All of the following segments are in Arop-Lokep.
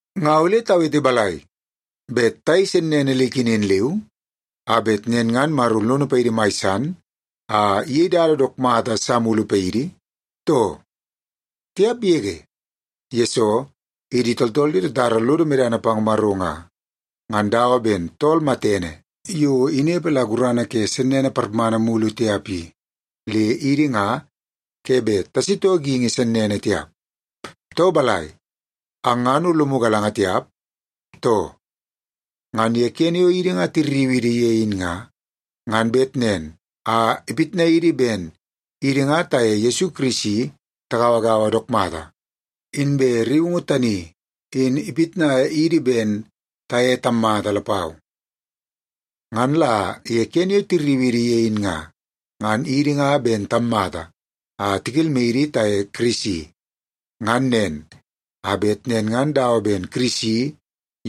Nga ole tawete balai? Bet tayei sennene le ikenen leu a bet nen ngan Maro lono paidi mai san a iyei dada dook mata sa mulu paidi, too? Tiap yege! Yesoo, idi tooltool yo tatara lodo medana pang Maro nga, ngan dawa ben tool matene yo inepe la gurana ke sennene parmana mulu tiap i, le idi nga ke bet tasitoo geingi sennene tiap. Too balai, ang ngan o lomu galanga tiap, too? Ngan ye kene yo idi nga tirriu idi ye in nga, ngan bet nen a ipitnai idi ben idi nga taye Yesu Kirisi tagauagaua dook mata, inbe rriungu tani in ipitnai idi ben taye tammata lapau. Ngan la ye kene yo tirriu idi ye in nga, ngan idi nga ben tammata a tikelmai idi taye Kirisi. Ngan nen, a bet nen ngan dawa ben Kirisi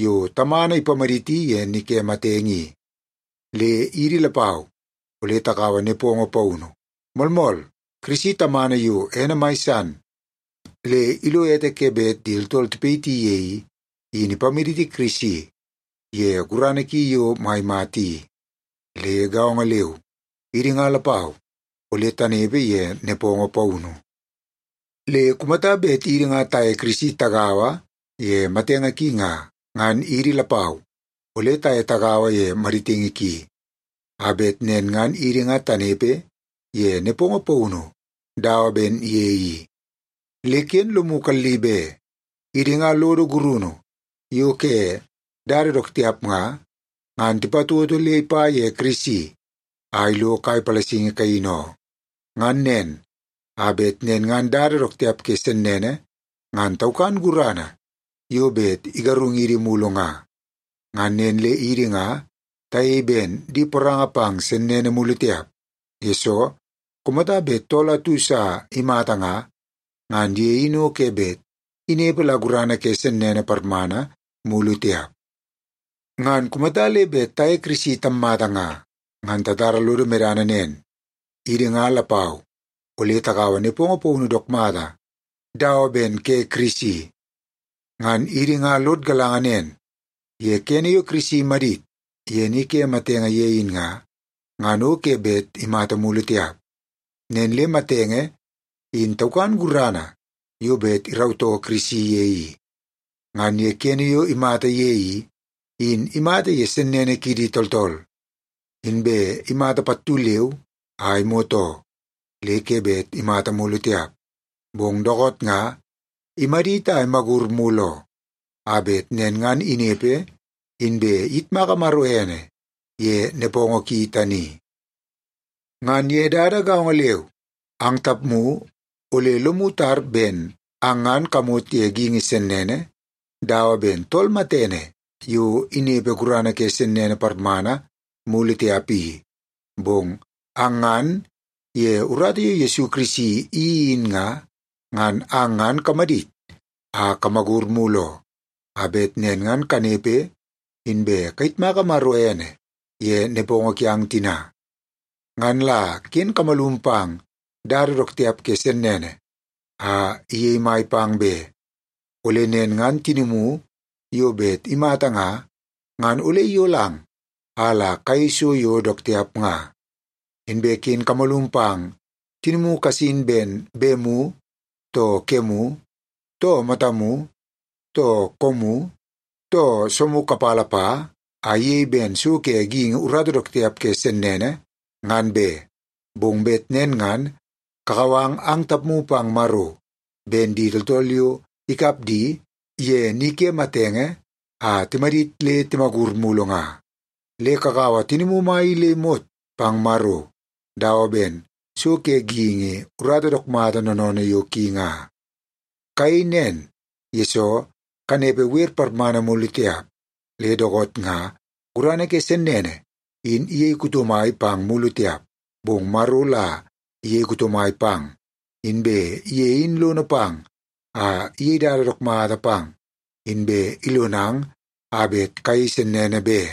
yo Tamana ipamaditi ye ni ke matenge i, le idi lapau ole takaua nepongo paunu. Moolmool, Kirisi Tamana yo ene mai san le ilo ete ke bet tooltool tipayiti ye i, in ipamaditi Kirisi ye gurana ki yo mai mata i. Le gaongo leu, idi nga lapau ole tanepe ye nepongo paunu. Le kumata bet idi nga taye Kirisi tagaua ye matenge ki nga, ngan idi lapau ole taye tagaua ye maditingi ki, a bet nen ngan idi nga tanepe ye nepongo paunu dawa ben ye i. Le ken lomu kalli be, idi nga lodo gurunu yo ke dada dook tiap nga, ngan tipatoto le ipa ye Kirisi a ilo kai palasingi kaini oo. Ngan nen, a bet nen ngan dada dook tiap ke sennene ngan taukan gurana yo bet igarungidi mulu nga. Ngan nen le idi nga tayei ben di poranga pang sennene mulu tiap, yesoo kumata bet tool atu sa imata nga, ngan ye in o ke bet inepe la gurana ke sennene parmana mulu tiap. Ngan kumata le bet taye Kirisi tammata nga, ngan tatara lodo medana nen; idi nga lapau ole takaua nepongo paunu dook mata dawa ben ke Kirisi. Ngan idi nga lod galanga nen, ye kene yo Kirisi imadit ye ni ke matenge ye in nga, ngan o ke bet imata mulu tiap. Nen le matenge in taukan gurana yo bet irautoo Kirisi ye i. Ngan ye kene yo imata ye i, in imata ye sennene kidi tooltool, inbe imata pattu leu a imot oo, le ke bet imata mulu tiap. Bong dookoot nga imadit a imagur mulu oo, a bet nen ngan inepe inbe iyitmaka Maro ene ye nepongo ki tani. Ngan ye dada gaongo leu, ang tapmu ole lomu tar ben ang ngan kamot ye geingi sennene dawa ben tool matene yo inepe gurana ke sennene parmana mulu tiap i. Bong ang ngan ye urata yo Yesu Kirisi iyeii in nga, ngan ang ngan kamadit a kamagur mulu oo, a bet nen ngan kanepe inbe kayitmaka Maro ene ye nepongo kiang tina. Ngan la ken kamalum pang dada dook tiap ke sennene a iyei mai pang be. Ole nen ngan tinimu yo bet imata nga, ngan ole iyolang a la kayei so yo dook tiap nga. Inbe ken kamalum pang tinimu kasin ben bemu, too kemu, too matamu, too koomu, too soomu kapala pa, a iyei ben so ke geingi urata dook tiap ke sennene, ngan be. Bong bet nen ngan kakau ang tapmu pang Maro, ben di tooltool yo ikap di ye ni ke matenge a timadit le timagur mulu nga. Le kakaua tinimu mai i le imot pang Maro dawa ben so ke geingi urata dook mata noonoonoo yo ki nga. Kayei nen, yesoo kanepe wer parmana mulu tiap. Le dookoot nga gurana ke sennene in iyei kuto mai pang mulu tiap, bong Maro la iyei kuto mai pang, inbe ye in lono pang a iyei dada dook mata pang inbe ilonang a bet kayei sennene be.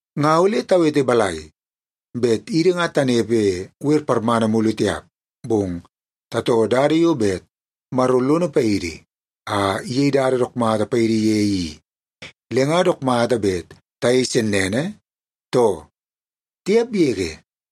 Nga ole tawete balai? Bet idi nga tanepe wer parmana mulu tiap, bong tatoo dada yo bet Maro lono paidi a iyei dada dook mata paidi ye i, le nga dook mata bet tayei sennene, too? Tiap yege!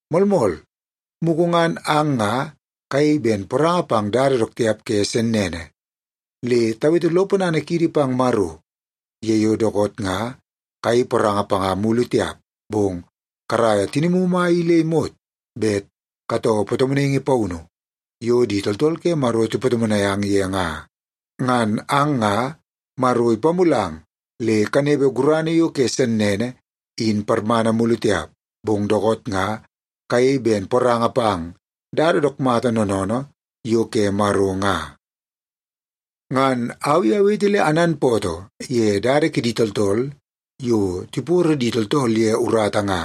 Moolmool, mugu ngan ang nga kayei ben poranga pang dada dook tiap ke sennene. Le tawete lo ponana kiidi pang Maro ye yo dookoot nga kayei poranga panga mulu tiap, bong karaia tinimu mai i le imot bet katoo patomonaingi paunu yo di tooltool ke Maro tipatomonai ang ye nga. Ngan ang nga Maro ipamulang le kanepe gurana yo ke sennene in parmana mulu tiap, bong dookoot nga kayei ben poranga pang dada dook mata noonoonoo yo ke Maro nga. Ngan au i awete le ananpootoo ye dada kidi tooltool yo tiporo di tooltool ye urata nga,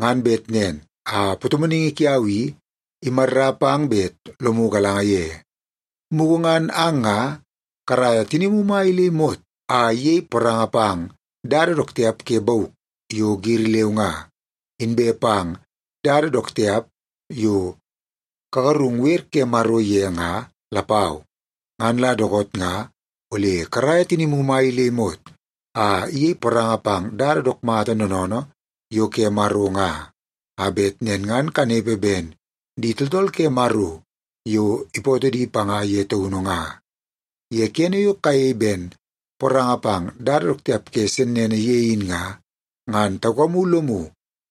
ngan bet nen a patomonaingi kiau i imarra pang bet lomu galanga ye. Mugu ngan ang nga karaia tinimu mai i le imot a iyei poranga pang dada dook tiap ke bauk yo giri leu nga, inbe pang dada dook tiap yo kagarung wer ke Maro ye nga lapau. Ngan la dookoot nga ole karaia tinimu mai i le imot a iyei poranga pang dada dook mata noonoonoo yo ke Maro nga, a bet nen ngan kanepe ben di tooltool ke Maro yo ipootoo di panga ye taunu nga. Ye kene yo kayei ben poranga pang dada dook tiap ke sennene ye in nga, ngan taukamu lomu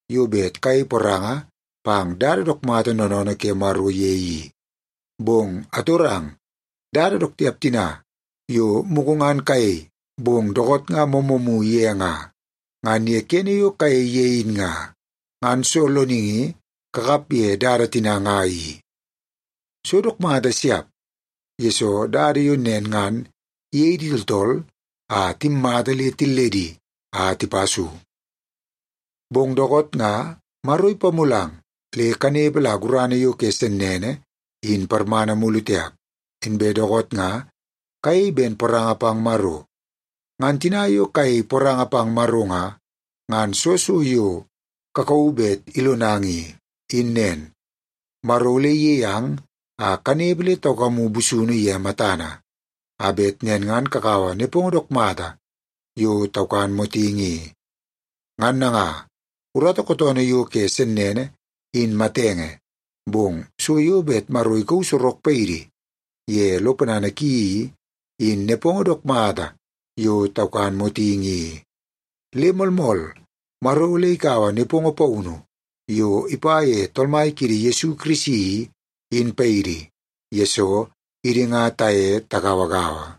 yo bet kayei poranga pang dada dook mata noonoonoo ke Maro ye i. Bong atorang, dada dook tiap tina yo mugu ngan kayei, bong dookoot nga moomoomu ye nga, ngan ye kene yo kayei ye in nga, ngan soo loningi kakap ye dada tina nga i? So dook mata siap, yesoo dada yo nen ngan iyei di tooltool a timmata le tilledi a tipa so. Bong dookoot nga Maro ipamulang le kanepe la gurana yo ke sennene in parmana mulu tiap, inbe dookoot nga kayei ben poranga pang Maro. Ngan tina kayei poranga pang Maro nga, ngan soo so yo kakauu bet ilonang i, in nen: Maro ole iyei ang a kanepe le taukamu busunu ye matana, a bet nen ngan kakaua nepongo dook mata yo taukan motingi i. Ngan nanga, urata kootoonoo yo ke sennene, in matenge, bong so yo bet Maro ikauu sorok paidi ye lo ponana ki i, in nepongo dook mata yo taukan motingi i. Le moolmool, Maro ole ikaua nepongo paunu yo ipa ye Tool Mai kiidi Yesu Kirisi i, in paidi, yesoo idi nga taye tagauagaua.